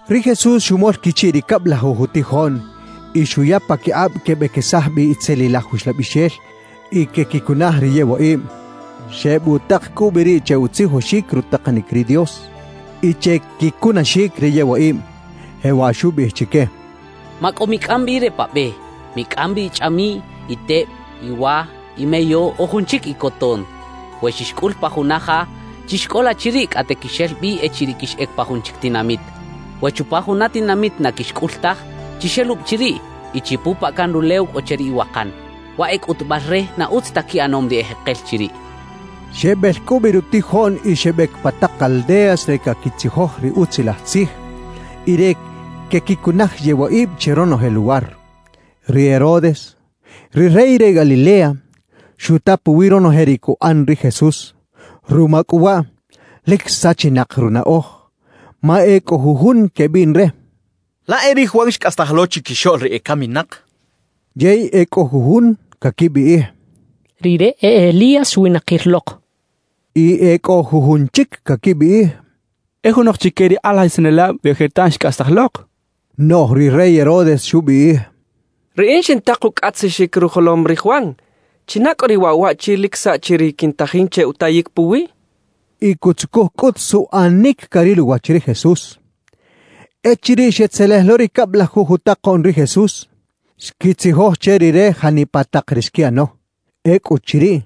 Ri Jesús xumol quichiꞌ ri cablajuj utijoꞌn y xuya paquikꞌab quebequesaj bi itzelilaj uxlabixel y quequicunaj ri yewaꞌib. Xebutak cꞌu bi riꞌ che utzijoxic rutakanic ri Dios y che quicunaxic ri yewaꞌib. Jewaꞌ xubiꞌij chique: «Macꞌo micꞌam bi re pa be; micꞌam bi ichꞌamiꞌy, iteb, iwa, imeyo o jun chic icoton. We xixcꞌul pa juna ja, chixcꞌola chiriꞌ cꞌate quixel bi echiriꞌ quixꞌec pa jun chic tinamit. We chupa juna tinamit na quixcꞌul taj, chixelubi chiriꞌ y chipupaꞌ can rulew cꞌo che ri iwakan, waꞌ e cꞌutubal re na utz ta quiꞌanom ri ejekel chiriꞌ» xcha chique. Xebel cꞌu bi rutijoꞌn y xebec pa tak aldeas re caquitzijoj ri Utzilaj Tzij y re quequicunaj yewaꞌib che ronoje luwar. Ri Herodes, ri rey re Galilea, xuta puwi ronoje ri cuꞌan ri Jesús. Ruma cꞌu waꞌ, lic sachinak runaꞌoj, ma e cꞌo jujun quebiꞌn re: «Laꞌ e ri Juan xcꞌastaj lo chiquixoꞌl ri ecaminak» quechaꞌ. Yey e cꞌo jujun caquibiꞌij: «Rire e Elías xwinakir lok.» Y e cꞌo jujun chic caquibiꞌij: «E junok chique ri kꞌalajisanelab re ojertan xcꞌastaj lok» quechaꞌ. Noꞌj ri rey Herodes xubiꞌij: «Riꞌin xintak ucꞌatzixic rujolom ri Juan. ¿China cꞌu riꞌ waꞌ waꞌchi lic saꞌchi ri quintajin che utayic puwiꞌ?» xchaꞌ. Y cutzucuj cꞌut suꞌanic caril uwach ri Jesús. Echiriꞌ xetzelej lo ri cablajuj utakoꞌn ri Jesús, xquitzijoj che Rire janipa tak ri xquiꞌano. Ecꞌuchiriꞌ,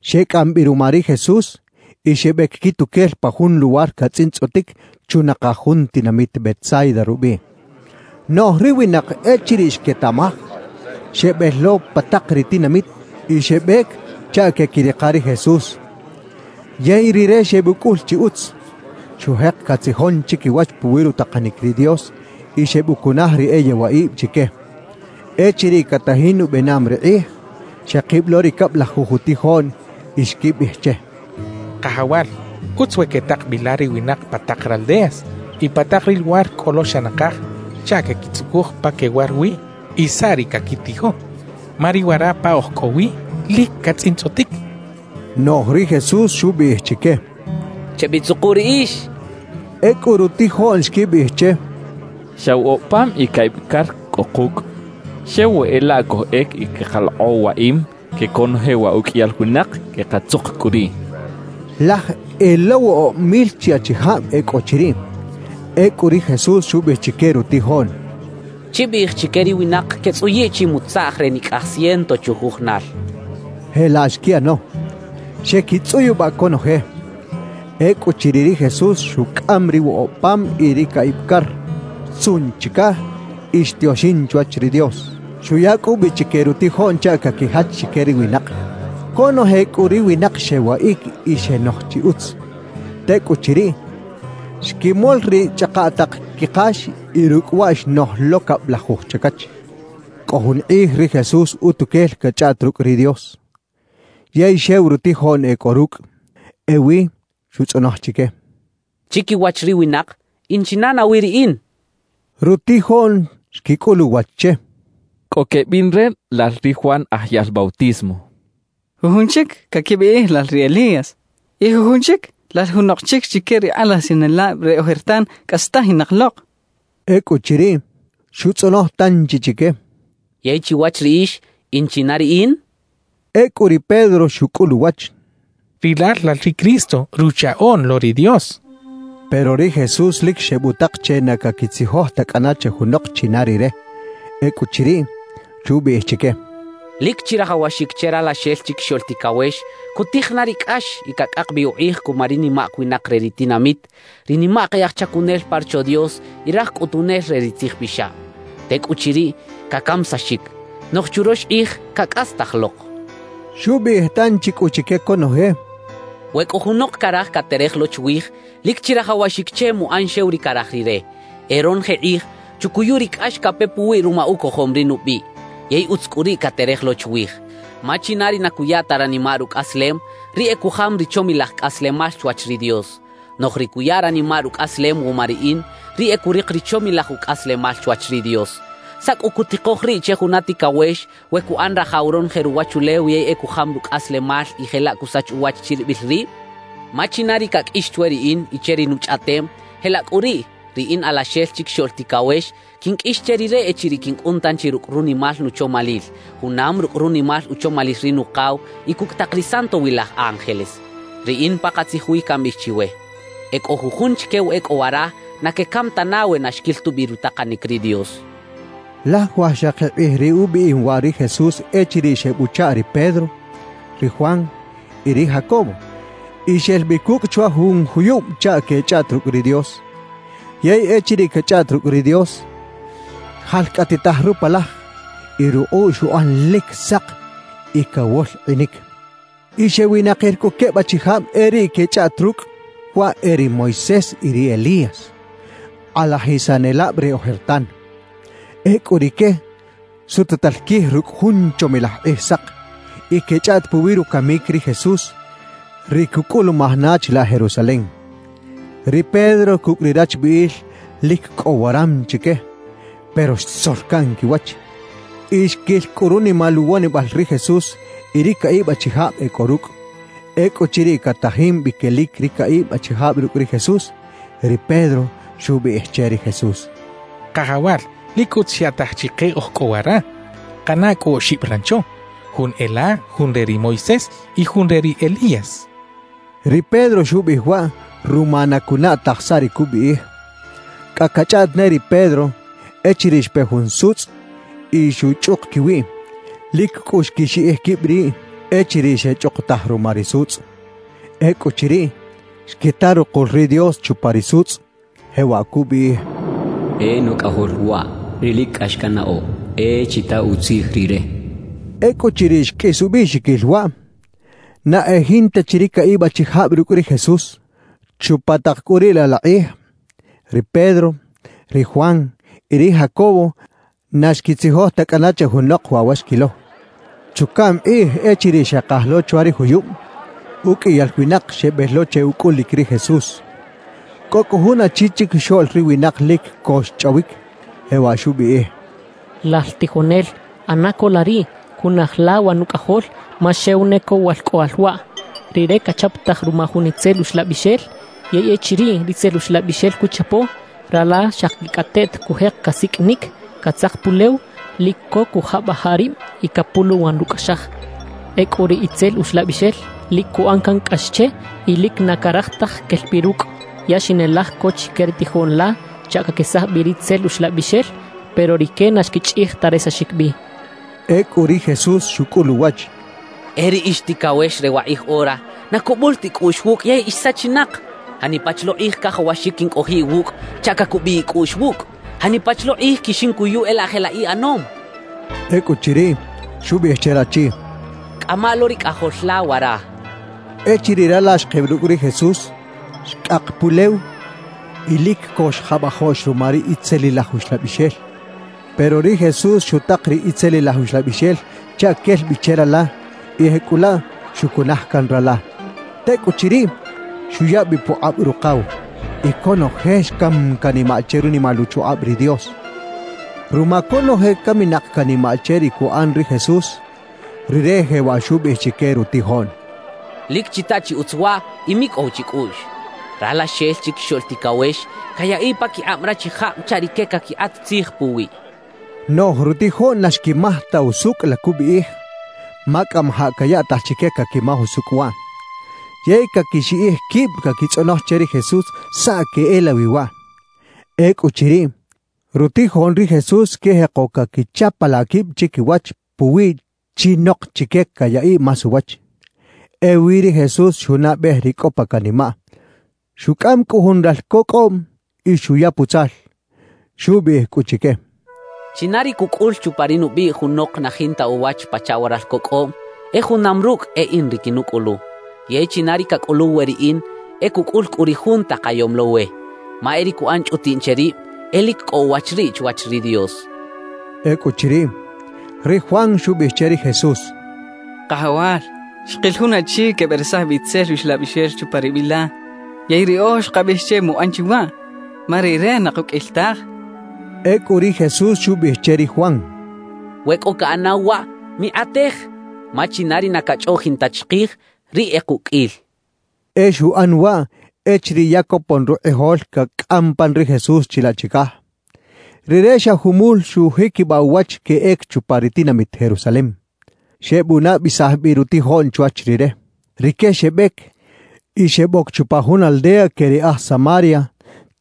xecꞌam bi ruma ri Jesús y xebec quituquel pa jun luwar catzꞌintzꞌotic chunakaj jun tinamit Betsaida rubiꞌ. Noꞌj ri winak echiriꞌ xquetaꞌmaj, xebel lo pa tak ri tinamit y xebec chaꞌ queꞌquirika ri Jesús. Yey Rire xebucꞌul chi utz, xujek catzijon chiquiwach puwi rutakanic ri Dios y xebucunaj ri e yewaꞌib chique. Echiriꞌ catajin ubenam ri kꞌij, xekib lo ri cablajuj utijoꞌn y xquibiꞌij che: —Kajawal, utz we quetak bi la ri winak pa tak raldeas y pa tak ri luwar cꞌo lo xa nakaj chaꞌ queꞌquitzucuj pa quewar wi y saꞌ ri caquitijo, ma ri wara pa oj cꞌo wi lic catzꞌintzꞌotic —xecha che. Noꞌj ri Jesús xubiꞌij chique: —Chebitzuku riꞌix —xchaꞌ. Ecꞌu rutijoꞌn xquibiꞌij che: —Xa woꞌob pam y caꞌib car cꞌo kucꞌ. Xew we e laꞌ cojꞌec y queꞌkalokꞌo waꞌim que conoje wa uqꞌuiyal winak, quekatzuk cꞌu riꞌ —xechaꞌ. Laj e lo woꞌob mil chi achijab e cꞌo chiriꞌ. Ecꞌu ri Jesús xubiꞌij chique rutijoꞌn: —Chibiꞌij chique ri winak quetzꞌuyiꞌ chimutzaꞌj re nicꞌaj ciento chujujunal —xchaꞌ. Jelaꞌ xquiꞌano, xequitzꞌuyubaꞌ conoje. Ecꞌuchiriꞌ ri Jesús xucꞌam ri woꞌob pam y ri caꞌib car, xtzuꞌn chicaj y xtioxin chwach ri Dios. Xuya cꞌu bi chique rutijoꞌn chaꞌ caquijach chique ri winak. Conoje cꞌu ri winak xewaꞌic y xenoj chi utz. Tecꞌuchiriꞌ, xquimol ri chꞌakaꞌtaꞌk quikax y rucꞌ waꞌ xnoj lo cablajuj chacach. Cꞌo jun kꞌij ri Jesús utuquel cachꞌaꞌt rucꞌ ri Dios, yey xew rutijoꞌn e cꞌo rucꞌ. Ewi xutzꞌonoj chique: —Chiquiwach ri winak, ¿in china nawi riꞌin? —xchaꞌ. Rutijoꞌn xquicꞌul uwach che: —Cꞌo quebiꞌn re lal ri Juan Aj Yaꞌl Bautismo; jujun chic caquibiꞌij lal ri Elías; y jujun chic, lal junok chic chique ri kꞌalajisanelab re ojertan cꞌastajinak lok —xechaꞌ. Ecꞌuchiriꞌ, xutzꞌonoj tanchi chique: —Yey chiwach riꞌix, ¿in china riꞌin? —xchaꞌ. Ecꞌu ri Pedro xucꞌul uwach: —Rilal lal ri Cristo, Ruchaꞌoꞌn lo ri Dios —xchaꞌ. Pero ri Jesús lic xebutak che na caquitzijoj ta cꞌana che junok china Rire. Ecꞌuchiriꞌ, xubiꞌij chique: —Lic chirajawaxic che Ralaxel Chiquixoꞌl Ticawex cutij na ri cꞌax y cacꞌak bi ukꞌij cuma ri nimak winak re ri tinamit, ri nimak e aj chacunel pa Rocho Dios y raj cꞌutunel re ri tzijpixab. Tecꞌuchiriꞌ, cacamisaxic; noꞌj churox kꞌij cacꞌastaj lok —xchaꞌ. Xubiꞌij tanchi cꞌu chique conoje: —We cꞌo junok caraj caterej lo chwij, lic chirajawaxic che muꞌan xew ri caraj rire, e ronoje kꞌij chucuyu ri cꞌax cape puwiꞌ ruma ucojom ri nubiꞌ; yey utz cꞌu riꞌ caterej lo chwij. Ma china ri na cuya ta ranimaꞌ rucꞌaslem, riꞌ e cujam ri chomilaj cꞌaslemal chwach ri Dios; noꞌj ri cuya ranimaꞌ rucꞌaslem wuma riꞌin, riꞌ e curik ri chomilaj ucꞌaslemal chwach ri Dios. »¿Saꞌ cꞌu cutikoj riꞌ che juna ticawex we cuꞌan rajaw ronoje ruwachulew, yey e cujam rucꞌaslemal y jelaꞌ cusach uwach chiribil rib? Ma china ri caqꞌuix chwe riꞌin y che ri nuchꞌaꞌtem, jelaꞌ cꞌu riꞌ ri in Alaxel Chiquixoꞌl Ticawex quinqꞌuix che rire echiriꞌ quincꞌun tanchi rucꞌ runimal nuchomalil, junam rucꞌ runimal uchomalil ri Nukaw y cucꞌ tak ri santowilaj ángeles. Riꞌin pakatzij wi cambiꞌij chiwe: E cꞌo jujun chique wa e cꞌo wara na quecam tana we na xquil tubi rutakanic ri Dios —xchaꞌ. Laj wajxakib kꞌij riꞌ ubiꞌim waꞌ ri Jesús echiriꞌ xebuchaꞌ ri Pedro, ri Juan y ri Jacobo y xel bi cucꞌ chwa jun juyub chaꞌ queꞌchꞌaꞌt rucꞌ ri Dios. Yey echiriꞌ cachꞌaꞌt rucꞌ ri Dios, xjalcꞌatitaj rupalaj y rukꞌuꞌ xuꞌan lic sak y cawolkꞌinic. Y xewinakir cꞌu queb achijab e riꞌ quechꞌaꞌt rucꞌ. Waꞌ e ri Moisés y ri Elías, kꞌalajisanelab re ojertan. Ecꞌu rique sututal quij rucꞌ jun chomilaj kꞌijsak. Y quechꞌaꞌt puwi rucamic ri Jesús, ri cucꞌulumaj na chilaꞌ Jerusalem. Ri Pedro cucꞌ ri rachbiꞌil lic cꞌo waram chique, pero xtzor caꞌn quiwach y xquil cꞌu runimal uwonibal ri Jesús y ri caꞌib achijab e cꞌo rucꞌ. Ecꞌuchiriꞌ catajin bi quelic ri caꞌib achijab rucꞌ ri Jesús, ri Pedro xubiꞌij che ri Jesús: —Kajawal, lic utz xyaꞌtaj chike oj cꞌo wara. Kaꞌana cꞌu oxib rancho: jun e la, jun re ri Moisés y jun re ri Elías —xchaꞌ. Ri Pedro xubiꞌij waꞌ ruma na cunaꞌ taj saꞌ ri cubiꞌij. Cꞌa cachꞌaꞌt ne ri Pedro, echiriꞌ xpe jun sutzꞌ y xuchꞌuk quiwiꞌ. Lic cꞌu xquixiꞌij quib riꞌ echiriꞌ xechꞌukutaj ruma ri sutzꞌ. Ecꞌuchiriꞌ, xquita rukul ri Dios chupa ri sutzꞌ, jewaꞌ cubiꞌij: «E Nucꞌajol waꞌ ri lic cꞌax cannaꞌo; e chita utzij Rire» cachaꞌ. Ecꞌuchiriꞌ xqꞌuis ubiꞌxiquil waꞌ, na e jinta chi ri caꞌib achijab rucꞌ ri Jesús. Chupa tak cꞌu riꞌ laꞌ la kꞌij, ri Pedro, ri Juan y ri Jacobo na xquitzijoj ta cꞌana che junok waꞌ wa xquilo. Chucaꞌm kꞌij echiriꞌ xekaj lo chwa ri juyub, uqꞌuiyal winak xebel lo che ucꞌulic ri Jesús. Cꞌo cꞌu jun achi chiquixoꞌl ri winak lic co xchꞌawic, jewaꞌ xubiꞌij: —Lal tijonel, ꞌana co la riꞌ, cunaj la wa nucꞌajol, ma xew ne co walcꞌoꞌal waꞌ. Rire cachaptaj ruma jun itzel uxlabixel. Yey echiriꞌ ritzel uxlabixel cuchapo, rala xakicꞌateꞌt cujek casiqꞌuinic, catzak pulew, lic co cujabajaꞌ rib y capuluwan rucꞌaxaj. Ecꞌu ri itzel uxlabixel lic cuꞌan can cꞌax che y lic na caraj taj quel bi rucꞌ. Ya xinelaj co chique ri tijoꞌn la chaꞌ caquesaj bi ri itzel uxlabixel, pero rique na xquichꞌij ta resaxic bi —xchaꞌ. Ecꞌu ri Jesús xucꞌul uwach: —¡E ri ix ticawex re wakꞌij ora, na cubul ta icꞌuꞌx wucꞌ yey ix sachinak! ¿Janipa chi lo kꞌij cajawaxic quincꞌojiꞌ iwucꞌ chaꞌ cacubiꞌ icꞌuꞌx wucꞌ? ¿Janipa chi lo kꞌij quixincuyu e laꞌ jelaꞌ iꞌanom? —xchaꞌ. Ecꞌuchiriꞌ, xubiꞌij che rachi: —Cꞌama lo ri cꞌajol la wara —xchaꞌ. Echiriꞌ rala xkib rucꞌ ri Jesús, xcꞌak pulew y lic co xjabajoꞌx ruma ri itzelilaj uxlabixel. Pero ri Jesús xutak ri itzelilaj uxlabixel chaꞌ quel bi che rala y jecꞌulaꞌ xucunaj can rala. Tecꞌuchiriꞌ, xuya bi pukꞌab rukaw. Y conoje xcam canimaꞌ che runimal uchukꞌab ri Dios. Ruma cꞌu conoje caminak canimaꞌ che ri cuꞌan ri Jesús, Rire jewaꞌ xubiꞌij chique rutijoꞌn: —Lic chita chi utz waꞌ y micꞌow chicꞌuꞌx: Ralaxel Chiquixoꞌl Ticawex cayaꞌiꞌ paquikꞌab rachijab chaꞌ rique caquikꞌat tzij puwiꞌ —xchaꞌ. Noꞌj rutijoꞌn na xquimaj ta usucꞌ la cubiꞌij, ma cꞌamajaꞌ cayaꞌtaj chique caquimaj usucꞌ waꞌ. Yey caquixiꞌij quib caquitzꞌonoj che ri Jesús saꞌ queꞌelawi waꞌ. Ecꞌuchiriꞌ, rutijoꞌn ri Jesús xquijeko caquichapalaꞌ quib chiquiwach puwiꞌ chinok chique cayaꞌiꞌ más uwach. Ewi ri Jesús xunaꞌbej ri cꞌo pa canimaꞌ. Xucꞌam cꞌu jun ralco cꞌoꞌm y xuya putzal. Xubiꞌij cꞌu chique: —China ri cucꞌul chupa ri nubiꞌ junok na jinta uwach pachaꞌ wa ralco cꞌoꞌm, e junam rucꞌ e in ri quinucꞌulu. Yey china ri cacꞌuluw we riꞌin, e cucꞌul cꞌu ri Jun takayom lo we. Ma e ri cuꞌan chꞌutiꞌn che rib, e lic cꞌo uwach riꞌ chwach ri Dios —xchaꞌ. Ecꞌuchiriꞌ, ri Juan xubiꞌij che ri Jesús: —Kajawal, xkil jun achi queberesaj bi itzel uxlabixel chupa ri biꞌ la; yey riꞌoj xkabiꞌij che muꞌan chi waꞌ, ma rire na kuqꞌuil taj —xchaꞌ. Ecꞌu ri Jesús xubiꞌij che ri Juan: —We cꞌo caꞌanaw waꞌ, mikꞌatej; ma china ri na cachꞌoꞌjin ta chikij, riꞌ e kuqꞌuil —xchaꞌ. E xuꞌan waꞌ echiriꞌ ya copon rukꞌijol cacꞌam pan ri Jesús chilaꞌ chicaj: Rire xa jumul xujiquibaꞌ uwach queꞌec chupa ri tinamit Jerusalem. Xebunabesaj bi rutijoꞌn chwach Rire. Rique xebec y xeboc chupa jun aldea que ri aj Samaria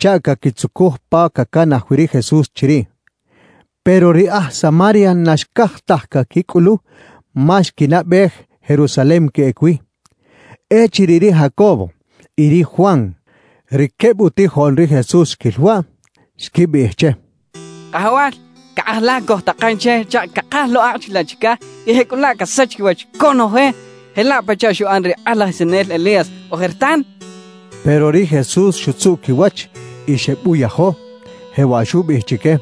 chaꞌ caquitzucuj pa cacanaj wi ri Jesús chiriꞌ. Pero ri aj Samaria na xcaj taj caquicꞌulu ma xquinaꞌbej Jerusalem queꞌec wi. Echiriꞌ ri Jacobo y ri Juan, ri queb utijoꞌn ri Jesús xquil waꞌ, xquibiꞌij che: —Kajawal, ¿caꞌaj la cojtakan che chaꞌ cakaj lo akꞌ chilaꞌ chicaj y jecꞌulaꞌ casach quiwach conoje, jelaꞌ pachaꞌ xuꞌan ri kꞌalajisanel Elías ojertan? —xechaꞌ. Pero ri Jesús xutzuꞌ quiwach y xebuyajo, jewaꞌ xubiꞌij chique: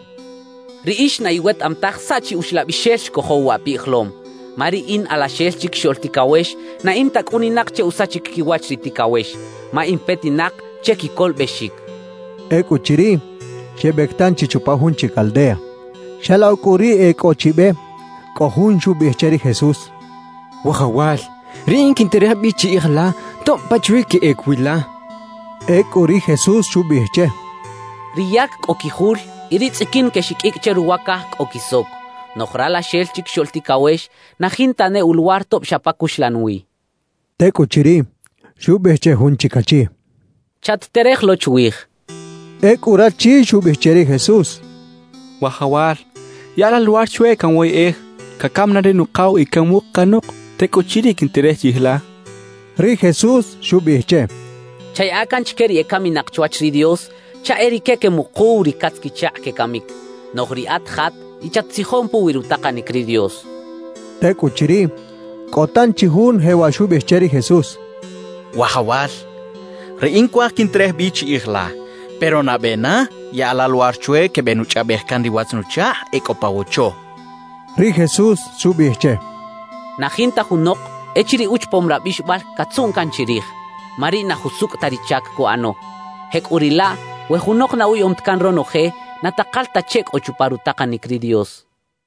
—Riꞌix na iwetaꞌam taj saꞌ chi uxlabixel xcojow waꞌ pijolom. Ma ri in Alaxel Chiquixoꞌl Ticawex na in ta cꞌuninak che usachic quiwach ri ticawex; ma in petinak che quicolobexic —xchaꞌ. Ecꞌuchiriꞌ, xebec tanchi chupa jun chic aldea. Xalokꞌ cꞌu riꞌ e cꞌo chi be, cꞌo jun xubiꞌij che ri Jesús: —Wajawal, riꞌin quinterej bi chiꞌij la tob pachawi queꞌec wi la —xchaꞌ. Ecꞌu ri Jesús xubiꞌij che: —Ri yac cꞌo quijul y ri tzꞌiquin quexiqꞌuicꞌ che ruwa caj cꞌo quisoc; noꞌj Ralaxel Chiquixoꞌl Ticawex na jinta ne uluwar tob xa pa cuxlan wi —xchaꞌ. Tecꞌuchiriꞌ, xubiꞌij che jun chic achi: —Chat-terej lo chwij —xchaꞌ. Ecꞌu rachi xubiꞌij che ri Jesús: —Wajawal, yaꞌa la luwar chwe canwoyꞌej cacam na ri nukaw y canmuk canok; tecꞌuchiriꞌ, quinterej chiꞌij la —xchaꞌ. Ri Jesús xubiꞌij che: —Chayaꞌa can chique ri ecaminak chwach ri Dios chaꞌ e rique quemukuw ri catz-quichakꞌ quecamic; noꞌj riꞌat jat y chat-tzijon puwi rutakanic ri Dios —xchaꞌ. Tecꞌuchiriꞌ, cꞌo tanchi jun jewaꞌ xubiꞌij che ri Jesús: —Wajawal, riꞌin cuaj quinterej bi chiꞌij la. Pero nabe na yaꞌa la luwar chwe quebenuchꞌaꞌbej can ri watz-nuchakꞌ e cꞌo pa wocho —xchaꞌ. Ri Jesús xubiꞌij che: —Na jinta junok echiriꞌ uchapom rabixobal catzuꞌn can chirij, ma riꞌ na jusucꞌ ta ri chac cuꞌano. Jecꞌuriꞌlaꞌ, we junok na uyaꞌom ta can ronoje, na takal ta che cꞌo chupa rutakanic ri Dios —xchaꞌ.